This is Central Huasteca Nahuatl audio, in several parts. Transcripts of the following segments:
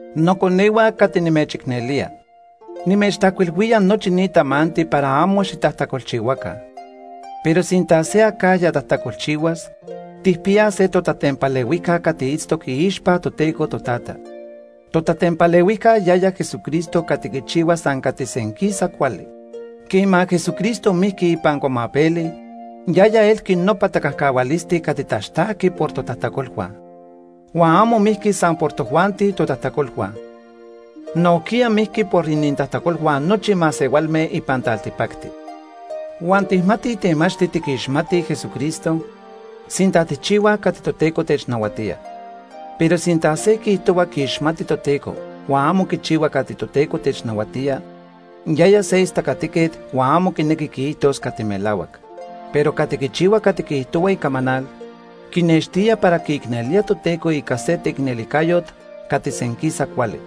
Noconehua cati nimechicnelía, nimechtajcuilhuía nochi ni tamanti para amo xitajtacolchihuaca. Pero sinta se acajya tajtacolchihuas, tijpiyaj se totatempalehuijca cati itztoc iixpa Toteco Totata. Totatempalehuijca yaya Jesucristo cati quichihua san cati senquisa cuali. Quema Jesucristo mijqui ipan cuamapeli, yaya elqui nopa tacajcahualisti cati taxtajqui por totajtacolhua. Huan amo mijqui san por tojuanti totajtacolhua. Nojquiya mijqui por inintajtacolhua nochi masehualme ipan taltipacti. Huan tijmatij temachti tiquixmatij Jesucristo, sinta tijchihuaj cati Toteco technahuatía. Pero sinta se quiijtohua quiixmati Toteco huan amo quichihua cati Toteco technahuatía, yaya se istacatiquet huan amo quinequi quiijtos cati melahuac. Pero cati quichihua cati quiijtohua icamanal, quinextía para quiicnelía Toteco ica se teicnelijcayot cati senquisa cuali.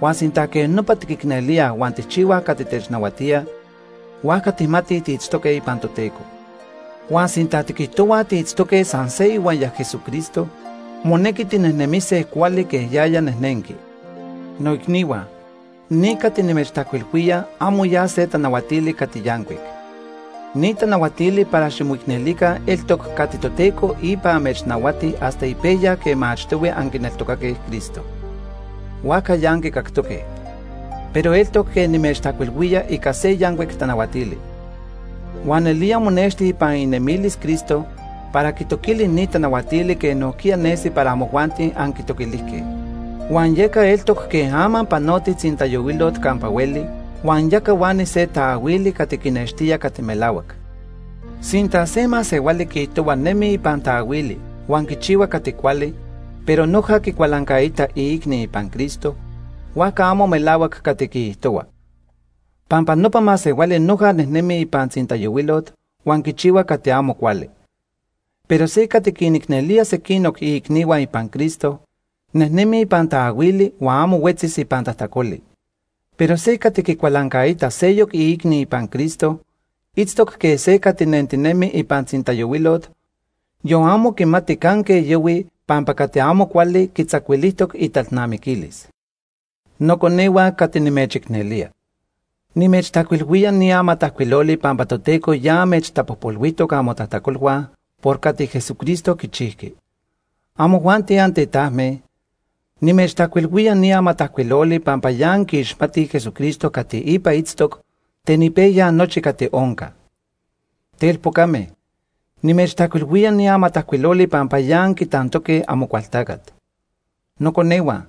Huan sinta quej nopa tiquicnelíaj huan tijchihuaj cati technahuatía, huajca tijmatij tiitztoque ipan Toteco. Huan sinta tiquijtohuaj tiitztoque san se ihuaya Jesucristo, monequi tinejnemise cuali quej yaya nejnenqui. Noicnihua, ni cati nimechtajcuilhuía amo ya se tanahuatili cati yancuic. Ni tanahuatili para ximoicnelica eltoc cati Toteco ipa amechnahuati hasta ipejya quema achtohui anquineltocaque Cristo. Huajca ya anquicactoque. Pero eltoc quej nimechtajcuilhuía ica se yancuic tanahuatili. Huan nelía monexti ipan inemilis Cristo para quitoquili ni tanahuatili quej nojquiya nesi para amojuanti anquitoquilijque. Huan yeca eltoc quej ama panotij tzintayohuilot campa hueli huan ya cahuani se taahuili cati quinextía cati melahuac. Sinta se masehuali quiijtohua nemi ipan taahuili huan quichihua cati cuali, pero noja quicualancaita iicni ipan Cristo, huajca amo melahuac cati quiijtohua. Pampa nopa masehuali noja nejnemi ipan tzintayohuilot huan quichihua cati amo cuali. Pero se cati quinicnelía sequinoc iicnihua ipan Cristo, nejnemi ipan taahuili huan amo huetzis ipan tajtacoli. Pero se cati quicualancaita seyoc iicni ipan Cristo, itztoc quej se cati nentinemi ipan tzintayohuilot, yon amo quimati canque yahui pampa cati amo cuali quitzacuilijtoc italnamiquilis. Noconehua cati nimechicnelía, nimechtajcuilhuía ni amatajcuiloli pampa Toteco ya amechtapojpolhuijtoc amotajtacolhua por cati Jesucristo quichijqui. Amojuanti antetajme, nimechtajcuilhuía ni amatajcuiloli pampa ya anquiixmatij Jesucristo cati ipa itztoc ten ipejya nochi cati onca. Telpocame, nimechtajcuilhuía ni amatajcuiloli pampa ya anquitantoque Amocualtacat. Noconehua,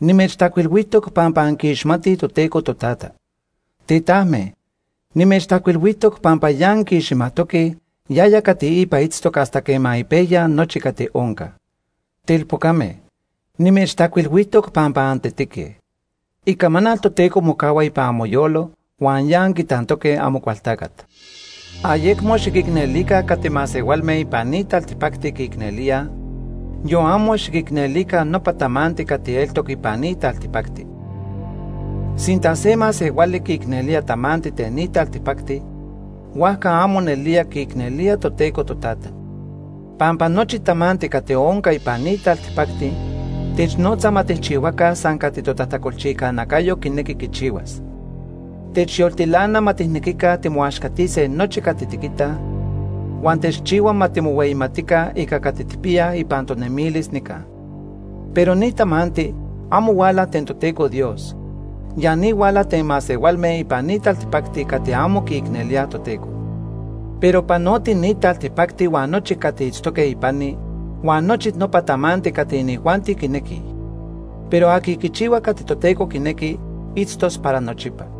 nimechtajcuilhuijtoc pampa anquiixmatij Toteco Totata. Tetajme, nimechtajcuilhuijtoc pampa ya anquiixmajtoque yaya cati ipa itztoc hasta quema ipejya nochi cati onca. Telpocame, nimechtajcuilhuijtoc pampa antetique. Icamanal Toteco mocahua ipan amoyolo huan ya anquitantoque Amocualtacat. Ayecmo xiquicnelica cati masehualme ipan ni taltipacti quiicnelíaj, yon amo xiquicnelica nopa tamanti cati eltoc ipan ni taltipacti. Sinta se masehuali quiicnelía tamanti ten ni taltipacti, huajca amo nelía quiicnelía Toteco Totata. Pampa nochi tamanti cati onca ipan ni taltipacti technotza ma tijchihuaca san cati totajtacolchijca nacayo quinequi quichihuas. Techyoltilana ma tijnequica timoaxcatise nochi cati tiquitaj, huan techchihua ma timohueyimatica ica cati tijpiyaj ipan tonemilis nica. Pero ni tamanti amo huala ten Toteco Dios, ya ni huala ten masehualme ipan ni taltipacti cati amo quiicnelíaj Toteco. Pero panoti ni taltipacti huan nochi cati itztoque ipani, huan nochi nopa tamanti cati inijuanti quinequij. Pero aqui quichihua cati Toteco quinequi, itztos para nochipa.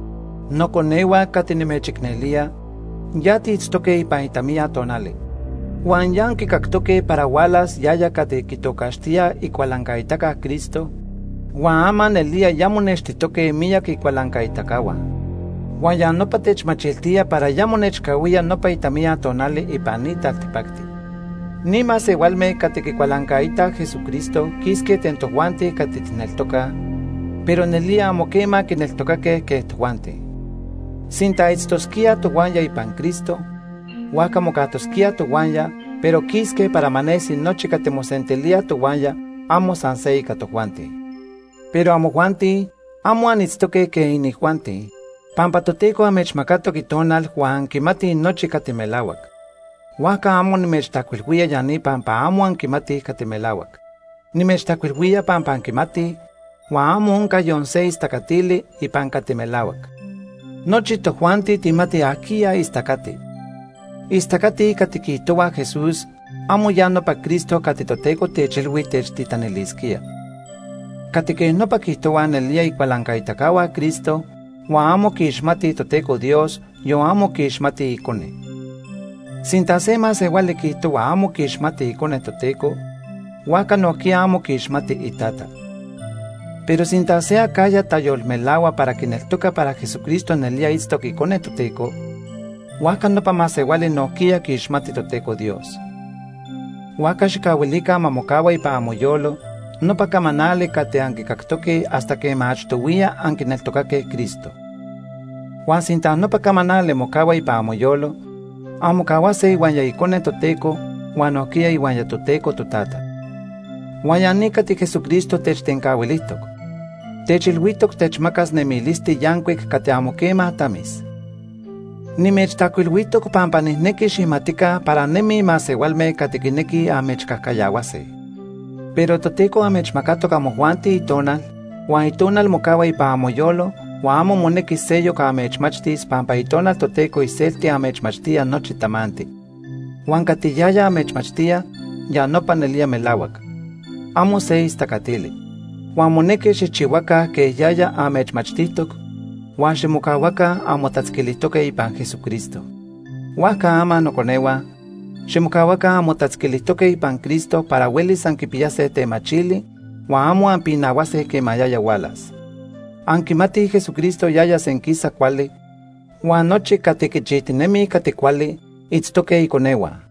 Noconehua cati nimechicnelía, ya tiitztoque ipan itamiya tonali. Huan ya anquicactoque para hualas yaya cati quitocaxtíaj Icualancaitaca Cristo, huan ama nelía ya monextijtoque miyac icualancaitacahua. Huan ya nopa techmachiltía para ya monechcahuía nopa itamiya tonali ipan ni taltipacti. Ni masehualme cati quicualancaitaj Jesucristo quisque ten tojuanti cati tijneltocaj, pero nelía amo quema quineltocaque quej tojuanti. Sinta itztosquíaj tohuaya ipan Cristo, huajca mocajtosquíaj tohuaya, pero quisque para ma nesi nochi cati mosentilíaj tohuaya amo san se ica tojuanti. Pero amojuanti, amo anitztoque quej inijuanti, pampa Toteco amechmacatoc Itonal huan anquimatij nochi cati melahuac. Huajca amo nimechtajcuilhuía ya ni pampa amo anquimatij cati melahuac. Nimechtajcuilhuía pampa anquimatij, huan amo onca yon se istacatili ipan cati melahuac. Nochi tojuanti tijmatij ajquiya istacati. Istacatij cati quiijtohuaj Jesús amo ya nopa Cristo cati Toteco techilhui techtitanilisquía. Cati quej nopa quiijtohuaj nelía icualancaitacahua Cristo huan amo quiixmatij Toteco Dios, yon amo quiixmatij Icone. Sinta se masehuali quiijtohua amo quiixmati Icone Toteco, huajca nojquiya amo quiixmati iTata. Pero sinta se acajya tayolmelahua para quineltoca para Jesucristo nelía itztoc Icone Toteco, huajca nopa masehuali nojquiya quiixmati Toteco Dios. Huajca xijcahuilica ma mocahua ipan amoyolo nopa camanali cati anquicactoque hasta quema achtohuiya anquineltocaque Cristo. Huan sinta nopa camanali mocahua ipan amoyolo, anmocahuase ihuaya Icone Toteco huan nojquiya ihuaya Toteco Totata. Huan ya ni cati Jesucristo techtencahuilijtoc; techilhuijtoc techmacas nemilisti yancuic cati amo quema tamis. Nimechtajcuilhuijtoc pampa nijnequi xijmatica para nemij masehualme cati quinequij amechcajcayahuase. Pero Toteco amechmacatoc amojuanti Itonal, huan Itonal mocahua ipan amoyolo huan amo monequi seyoc amechmachtis pampa Itonal Toteco iselti amechmachtía nochi tamanti. Huan cati yaya amechmachtía ya nopa nelía melahuac. Amo se istacatili. Huan monequi xijchihuaca quej yaya amechmachtijtoc, huan ximocahuaca anmotatzquilijtoque ipan Jesucristo. Huajca ama noconehua, ximocahuaca anmotatzquilijtoque ipan Cristo para huelis anquipiyase temachili huan amo anpinahuase quema yaya hualas. Anquimatij Jesucristo yaya senquisa cuali, huan nochi cati quichijtinemij cati cuali itztoque iconehua.